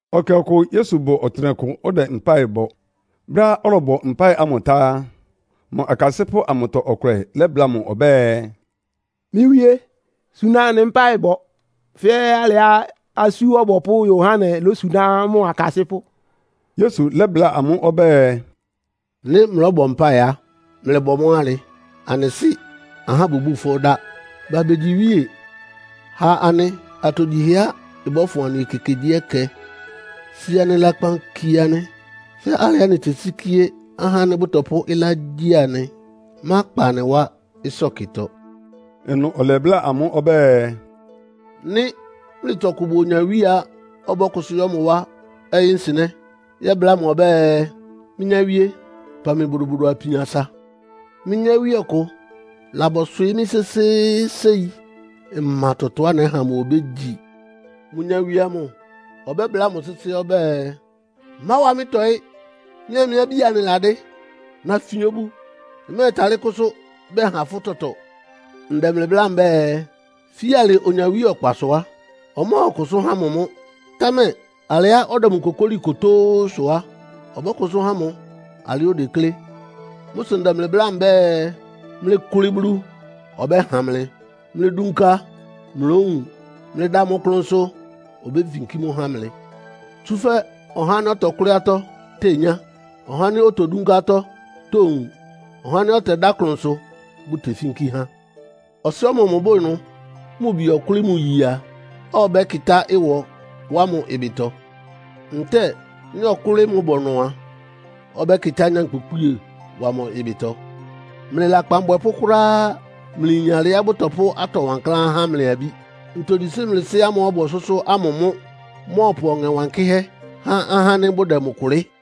Ɛkɛ ɔkʋ Yesu bʋ ɔtɩnɛkʋ ɔdɛ mpáɩ bɔ. Brɛ́á ɔlɔbɔ mpáɩ ámʋ tá á, mʋ akasɩ́pʋ́ amʋtɔ ɔkʋlɛ lɛ́bláa mʋ ɔbɛ́ɛ, “Mɩ́ Wíé, suna anɩ mpáɩ bɔ fɛ́ alɩá Asú Ɔbɔpʋ́ Yohane lósuná mʋ akasɩ́pʋ́.” Yesu lɛ́bláa amʋ́ ɔbɛ́ɛ, “Nɩ́ mlɔ́bɔ mpáɩ á, mlɩbɔ mʋ́ alɩ. ‘Anɩ Sɩ́, ahá bʋbúu fʋ́ dá. Ba begyi iwíe. Ha anɩ atogyihɛá ɩbɔ́fʋn anɩ ekekegyíɛkɛ. Si anɩ lakpan kie anɩ, fɛ́ alɩá anɩtesíkíé ahá ánɩ́ bʋtɔpʋ́ ɩlá gyi anɩ. Mákpa anɩ wá ɩsɔ́kɩtɔ.’” Ɩnʋ ɔlɛbláa amʋ́ ɔbɛ́ɛ, “Nɩ́ mlɩtɔ ɔkʋ bʋ onyawíe a, ɔbɔ́kʋsʋ́ yɔ́ mʋ wá ɔyɩ́nsɩnɛ́ yɛ́bláa mʋ ɔbɛ́ɛ, ‘Mɩ́ nyáwíé, pan mɩ bodobodo apin asa. Mɩ́ nyáwíe ɔkʋ labɔswɩɩ́ mɩ́ sésééséi. Mma tɔtɔá nɛ́ha mʋ obégyi.’ “Mʋ nyawie amʋ ɔbɛ́bláa mʋ sɩ́sɩ́ ɔbɛ́ɛ, ‘Máwa mɩ́ tɔ́ɩ. Mɩ́a mɩ́ abí anɩladɩ́. Nafin obu, mmɛ́ɛtalɩ́ kʋ́sʋ́ bɛha fʋ́ tɔtɔ.’ Ndɛ mlɩ bláa mbɛ́ɛ, fíalɩ onyawíe ɔkpasʋ á, ɔmɔ́ɔkʋsʋ́ há mʋ. Támɛ alɩá ɔdɛ mʋ kokóli kótóó sʋ á, ɔbɔ́kʋsʋ́ há mʋ alɩá odeklé. “Mʋ́ sʋ ndɛ mlɩ bláa mbɛ́ɛ, mlɩkʋlɩ Bulu, ɔbɛ́ha mlɩ. Mlɩdunka, mlówun. Mlɩda mʋ klʋnsʋ, obéfinkí mʋ́ há mlɩ. Tsúfɛ́ ɔhá ánɩ́ ɔtɔkʋ́lɩ́ atɔ́ tenyá. Ɔhá ánɩ́ otodúnká atɔ́ towun. Ɔhá ánɩ́ ɔtɛdá klʋnsʋ bʋ́tefínkí há. Ɔsɩ́ ɔmɔmʋ bʋ ɩnʋ, mʋ bi ɔkʋ́lɩ́ mʋ iye a, ɔbɛ́kɩtá ɩwɔ wá mʋ ɩbɩtɔ? Ntɛ́ɛ nɩ́ ɔkʋ́lɩ́ mʋ bɔnɔ a, ɔbɛ́kɩtá nyankpʋkpíe wá mʋ ɩbɩtɔ? Mlɩ lakpan abwɛpʋ́ kʋ́ráá mlɩyin alɩá bʋtɔpʋ́ atɔ wankláán há mlɩ abí. Ntogyi sʋ́ mlɩ Sɩ́ ámʋ́ʋ́ ɔbʋ ɔsʋ́sʋ́ ámʋ mʋ́ mɔ́ɔpʋ Ɔŋɛ Wankɩ́hɛ́ há ahá ánɩ́ bʋdɛ mʋ kʋlɩ́?”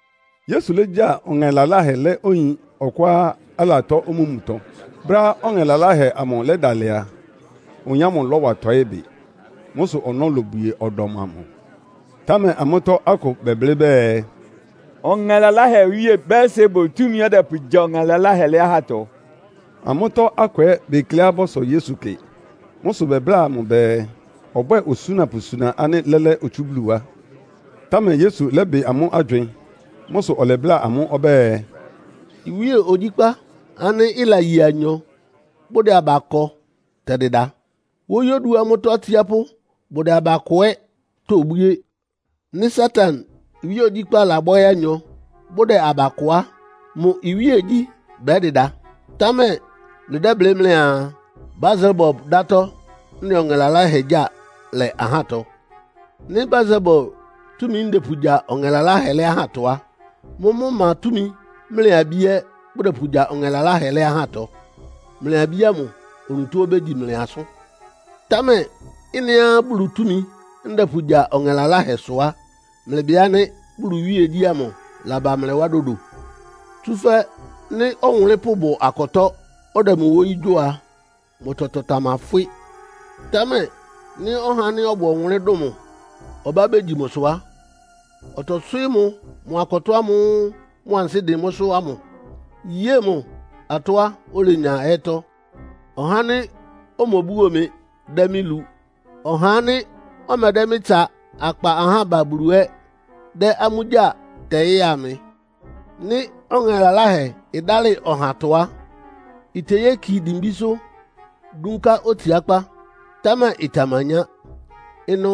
Yesu légya ɔŋɛ laláhɛ lɛ́ oyin ɔkʋá alatɔ́ omúmutɔ. Brɛ́á ɔŋɛ laláhɛ amʋ lɛ́dalɩ a, oyin ámʋ lɔ́wa tɔɩ́ bɩ. Mʋ́ sʋ ɔnɔ́ lobwie ɔdɔm amʋ. Támɛ amʋ́tɔ́ akʋ bɛblɩ́ bɛɛ, “Ɔŋɛ laláhɛ owíe Beelsebul túmi ɔdɛpʋgya ɔŋɛ laláhɛ lɛ́ ahátɔ.” Amʋ́tɔ́ akʋ ɛ́ bekleá bɔ́sɔ Yesu kɩ. Mʋ́ sʋ bɛbláa mʋ bɛɛ, ɔbwɛ́ɛ osúna pʋsuna ánɩ́ lɛ́lɛ́ otsú Bulu wá. Támɛ Yesu lɛ́bɩ amʋ́ agywɩɩn. Mʋ́ sʋ ɔlɛbláa amʋ́ ɔbɛ́ɛ, “Iwíe ogyíkpá ánɩ́ ɩlaye anyɔ, bʋdɛ aba kɔ tɛdɩda. Wóyí oduá mʋ́tɔ́ atsiápʋ́ bʋdɛ aba kɔ ɛ́ tobwíé. Nɩ́ Satan iwíe ogyíkpá labɔ́ɩ́ anyɔ, bʋdɛ aba kɔ á, mʋ iwíegyí bɛ́dɩda. Támɛ mlɩdɛ́blɩ́ mlɩaa, Beelsebul dátɔ́ ndɛ ɔŋɛ laláhɛ gyáa lɛ ahátɔ. Nɩ́ Beelsebul túmi ndɛpʋgya ɔŋɛ laláhɛ lɛ́ ahátɔ á, mʋ́mʋ́ ma túmi mlɩ abí ɛ́ bʋdɛpʋgya ɔŋɛ laláhɛ lɛ́ ahátɔ? Mlɩ abí ámʋ onutó obégyi mlɩ asʋ́n. Támɛ ɩ́nɩá Bulu túmi ndɛpʋgya ɔŋɛ laláhɛ sʋ á, mlɩbɩ ánɩ́ Bulu iwíegyí ámʋ laba mlɩ wá dodo. “Tsúfɛ́ nɩ́ ɔwʋnlɩ́npʋ́ bʋ akɔtɔ́, ɔdɛ mʋ wóyí gyo a, mʋ tɔtɔ tamafwɩ́. Támɛ nɩ́ ɔhá ánɩ́ ɔbʋ ɔwʋnlɩ́n dʋn mʋ ɔbá begyi mʋsʋ á, ɔtɔswɩ́ɩ́ mʋ mʋ akɔtɔ́ ámʋ́ʋ́ mʋ ansɩ́ dɩn mʋ́sʋ́ ámʋ, yée mʋ atɔ́á olenya ɛ́tɔ́. “Ɔhá ánɩ́ omobuo mɩ dɛ́ mɩ́ lu. Ɔhá ánɩ́ ɔmɛdɛ́ mɩ́ tsa akpa ahá ba Bulu ɛ́ dɛ́ amʋ́ gyáa tɛɩ́a mɩ. “Nɩ́ ɔŋɛ laláhɛ ɩdálɩ ɔhatɔ á, iteyéki dimbísʋ́ dúnká otsiákpá, támɛ ɩtamanyá. Ɩnʋ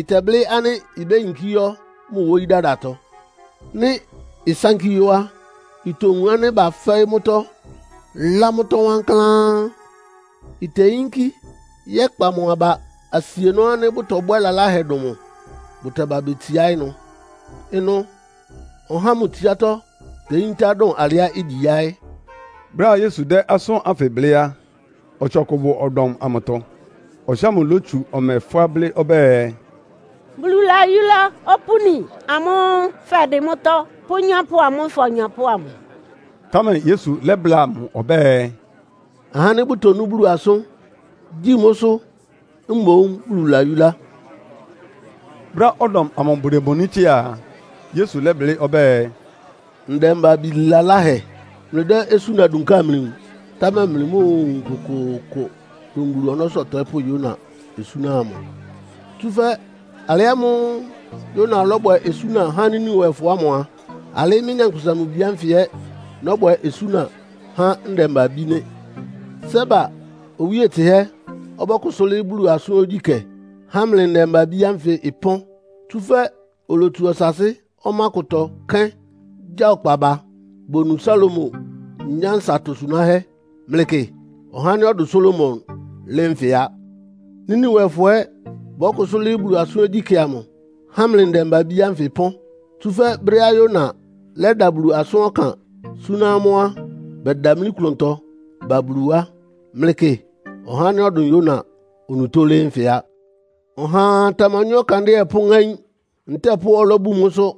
ɩtɛblɩ́ ánɩ́ ibéyinkí yɔ́ mʋ́ wóyí dadatɔ. Nɩ́ ɩsánkí yɔ́ á, itowun ánɩ́ bafɛ́ɩ́ mʋ́tɔ́, lá mʋ́tɔ́ wankláán. Iteyínkí yɛ́kpa mʋ́ aba asienɔ́ ánɩ́ bʋtɔbwɛ́ lalahɛ dʋn mʋ, bʋtɛba betsiá ɩnʋ. Ɩnʋ ɔhá ámʋ tsiátɔ́ teyíntá dʋn alɩá igyi yáɩ́.” Brɛ́á Yesu dɛ́ asʋ́n ánfɩ blɩ́ á, ɔtsɩ ɔkʋ bʋ ɔdɔm amʋtɔ. Ɔtsɩ ámʋ lótsu ɔmɛ fʋ́á blɩ́ ɔbɛ́ɛ, “Bulu layúlá opúni amʋ́ʋ́ fɛdɩ mʋ́tɔ́ pʋ́ nyɔ́pʋ amʋ́ʋ́ fɔnyɔpʋ́ ámʋ.” Támɛ Yesu lɛ́bláa mʋ ɔbɛ́ɛ, “Ahá ánɩ́ bʋtonú Bulu asʋ́n, gyí mʋ́sʋ́ mboún Bulu layúlá!” Brɛ́á ɔdɔm amʋ bʋdemoní tsɩ́a a, Yesu lɛ́blɩ́ ɔbɛ́ɛ, “Ndɛmba-abí laláhɛ, mlɩdɛ́ osúna dunká amlɩwun, támɛ mlɩmóowun kʋkʋʋkʋ dʋn Bulu ɔnɔ́sʋ́ ɔtɔɩ́pʋ́ Yona osúna amʋ. Tsúfɛ́ alɩ ámʋ́ʋ́ Yona lɔ́bwɛ osúna há Niniwefɔ ámʋ a, alɩ mɩ́, Nyankpʋsa-Mʋ-Bi ánfɩ ɛ́ nɔ́bwɛ osúna há ndɛmba-abí nɩ́. Seba owíe tsɩhɛ́ ɔbɔ́kʋsʋ́ lɩ́ɩ́ Bulu asʋ́n ogyíkɛ́, há mlɩ ndɛmba-abí ánfɩ ɩpɔ́n. Tsúfɛ́ olotsu ɔsaasɩ́ ɔmá kʋtɔ kéín gya ɔkpa ba, bonu Salomo nyánsa atosunáhɛ́. Mlɩkɩ, ɔhá ánɩ́ ɔdʋn Salomo lɩ́ɩ́ nfɩ á. Niniwefɔ ɛ́ bɔ́kʋsʋ́ lɩ́ɩ́ Bulu asʋ́n ogyíkɛ́ amʋ, há mlɩ ndɛmba-abí ánfɩ ɩpɔ́n. Tsúfɛ́ brɛ́á Yona lɛ́da Bulu asʋ́n ɔkan súná amʋ́ á, bɛdamlí klʋntɔ ba Bulu wá. Mlɩkɩ, ɔhá ánɩ́ ɔdʋn Yona onutó lɩ́ɩ́ nfɩ á. “Ɔhaa tamanywɛ́ ɔkandɩ́ɛ pʋ́ŋáín, ntɛ́ɛ pʋ́ ɔlɔ́ bun mʋ́sʋ́.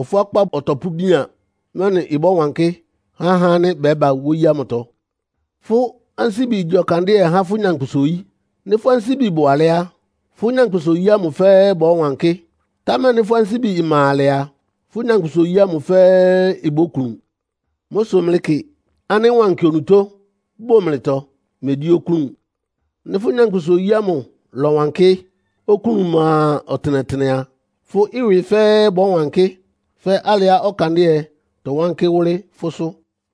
Ɔfʋákpá ɔtɔpʋ́bian, mɛ́nɩ ɩbɔ́wankɩ́ há ahá ánɩ́ bɛ́ba wóyí ámʋtɔ. Fʋ́ ansíbi igyi ɔkandɩ́ɛ há fʋ́ nyankpʋsa-oyí. Nɩ́ fʋ́ ansíbi bʋ alɛ́ á, fʋ́ nyankpʋsa-oyí ámʋ fɛ́ɛ́ bɔ́wankɩ́. Támɛ nɩ́ fʋ́ ansíbi ma alɛ a, fʋ́ nyankpʋsa-oyí ámʋ fɛ́ɛ́ ibóklun. Mʋ́ sʋ mlɩkɩ ánɩ́ wankɩ onutó bʋ́ mlɩtɔ, megyí oklún. Nɩ́ fʋ́ nyankpʋsa-oyí ámʋ lɔ́wankɩ́, oklún ma ɔtɩnɛtɩnɛ a, fʋ́ ɩwɩ fɛ́ɛ́ bɔ́wankɩ́ fɛ́ alɩá ɔkandɩ́ɛ tɔwánkɩ́ wʋ́lɩ́ fʋ́sʋ́.”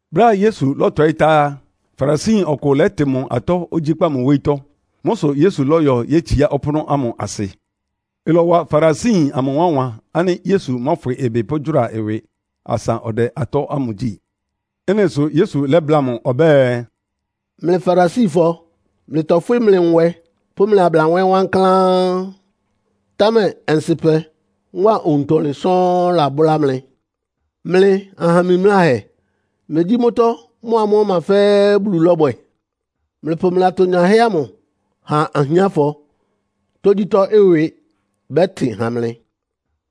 Brɛ́á Yesu lɔ́tɔɩ́ tá á, Farisiyin ɔkʋ lɛ́tɩ mʋ atɔ́ ogyíkpá mʋ wóyítɔ́. Mʋ́ sʋ Yesu lɔ́yɔ yétsiá ɔpʋ́nʋ́ ámʋ asɩ. Ɩlɔwa Farisiyin amʋ wánwan ánɩ́ Yesu mɔ́fwɩ ɩbɩ pʋ́gyʋ́ra ɩwɩ asa ɔdɛ atɔ́ ámʋ gyí. Ɩ́nɩ sʋ Yesu lɛ́bláa mʋ ɔbɛ́ɛ, “Mlɩ Farisifɔ mlɩtɔfwɩ́ mlɩ nwɛ pʋ́ mlɩ ablanwɛ́ wankláán, támɛ ɔnsɩ́pɛ mʋ́a owuntɔlɩn sɔ́ɔ́n lábʋ́lá mlɩ. Mlɩ aha mimláhɛ, megyí mʋ́tɔ́ mʋ́a mʋ́ ɔma fɛ́ɛ́ Bulu lɔ́bwɛ? Mlɩpʋ mlɩ atonyahɛ́ ámʋ ha ahiánfɔ, tógyítɔ́ ɩwɩ bɛ́tɩn ha mlɩ.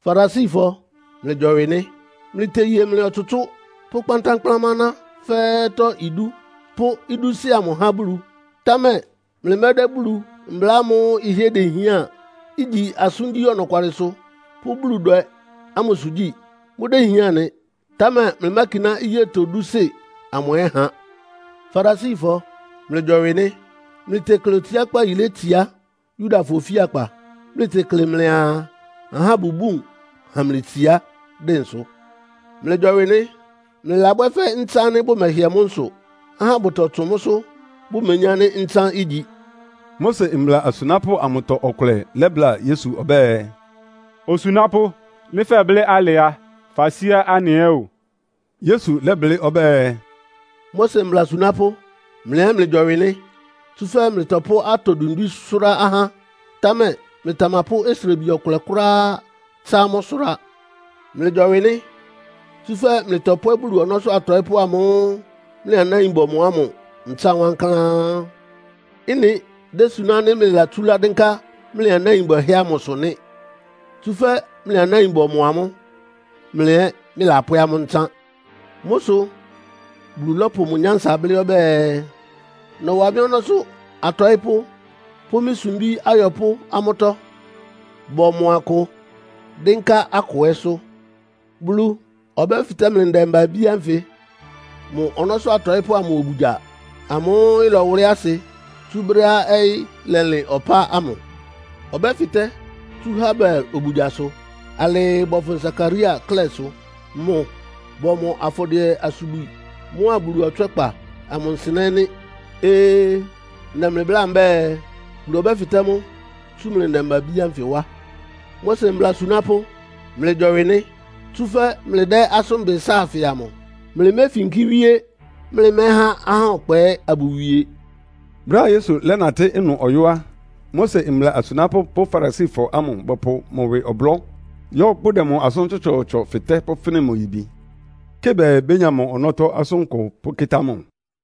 “Farisifɔ, mlɩgyɔwɩ nɩ́! Mlɩteye mlɩ ɔtsʋtsʋ́ pʋ́ kpántánkplámá aná fɛ́ɛ́tɔ́ idú, pʋ́ idúsɩ́ amʋ há Bulu. Támɛ mlɩmɛ́dɛ́ Bulu mbla ámʋ́ʋ́ ɩhɩ́ɛ́ dehián, igyi asʋ́ngyí ɔnɔkwalɩsʋ pʋ́ Buludwɛ ámʋsʋ gyí. Mʋ́déhián nɩ, támɛ mlɩmákiná iyétɔ dúsɩ́ amʋ ɛ́ ha. “Farisifɔ, mlɩgyɔwɩ nɩ́! Mlɩtekle otsiákpá yílé tsiá Yudafɔ ofíakpa. Mlɩtekle mlɩaa, ahá bʋbún ha mlɩ itsiá dɩnsʋ. Mlɩgyɔwɩ nɩ́! Mlɩlabwɛ́ fɛ́ ntsán ánɩ́ bʋmɛhɩɛ mʋ́ nsʋ, ahá bʋtɔtsʋn mʋ́sʋ́ bʋmeyín ánɩ́ ntsán igyi.” Mose mbla asunápʋ́ amʋtɔ ɔkʋlɛ lɛ́bláa Yesu ɔbɛ́ɛ, “Osunápʋ́, nɩ́ fɛblɩ́ alɩ á, fasíá anɩ ɛ́ o.” Yesu lɛ́blɩ́ ɔbɛ́ɛ, “Mose mbla asunápʋ́, mlɩ ɛ́ mlɩgyɔwɩ nɩ́! Tsúfɛ́ mlɩtɔpʋ́ atɔ dwindwín sʋ́rá ahá, támɛ mlɩtamapʋ́ osrebi ɔkʋlɛ kʋ́ráá tsá amʋ́ sʋrá. Mlɩgyɔwɩ nɩ́! Tsúfɛ́ mlɩtɔpwɛ́ Bulu ɔnɔ́sʋ́ atɔɩ́pʋ́ amʋ́ʋ́ mlɩ anáin bɔmɔ ámʋ ntsán wankláán. Ɩ́nɩ désuná ánɩ́ mlɩlatsúlá dɩ́nká mlɩ anáin bwɛhɛ́ ámʋsʋ nɩ́. Tsúfɛ́ mlɩ anáin bɔmɔ amʋ́, mlɩ ɛ́ mlɩlapwɛ́ amʋ́ ntsán. Mʋ́ sʋ Bulu lɔ́pʋ mʋ nyánsa blɩ́ ɔbɛ́ɛ, ‘Nɔ́wa mɩ́ ɔnɔ́sʋ́ atɔɩ́pʋ́ pʋ́ mɩ́ sumbí ayɔpʋ́ amʋ́tɔ́. Bɔ́mɔ akʋ, dɩ́nká akʋ ɛ́sʋ́.’ Bulu ɔbɛ́fɩtɛ́ mlɩ ndɛmba-abí ánfɩ mʋ ɔnɔ́sʋ́ atɔɩ́pʋ́ ámʋ obugya amʋ́ʋ́ ɩlɔwʋlɩ́ asɩ tsú brɛ́á ɔyɩ́ lɛlɩn ɔpá ámʋ. Ɔbɛ́fɩtɛ́ tsú Habel obugyasʋ alɩɩ bɔfʋn Sakaria klɛ́sʋ. Mʋ bɔmɔ afɔdɩɛ-asubwi mʋ́a Bulu ɔtswɛ́kpa amʋ nsɩnɛ́ nɩ́. Ee! Ndɛ mlɩ bláa mbɛ́ɛ, Bulu ɔbɛ́fɩtɛ́ mʋ́ tsú mlɩ ndɛmba-abí ánfɩ wá. “Mose mbla asunápʋ́, mlɩgyɔwɩ nɩ́! Tsúfɛ́ mlɩdɛ́ asʋ́nbɩ sáafɩ amʋ. Mlɩméfínkí wíé, mlɩmɛ́há ahá ɔkpa ɛ́ abʋwie.” Brɛ́á Yesu lɛ́natɩ́ ɩnʋ ɔyɔ́ á, Mose mbla asunápʋ́ pʋ́ Farisifɔ ámʋ bɔpʋ mʋ ɩwɩ ɔblɔ́, yɔ́ bʋdɛ mʋ asʋ́n tsɔtsɔɔtsɔ fɩtɛ́ pʋ́fɩ́nɩ mʋ yibi, kɩ bɛɛ bénya mʋ ɔnɔ́tɔ́ asʋankʋ pʋ́kɩ́tá mʋ.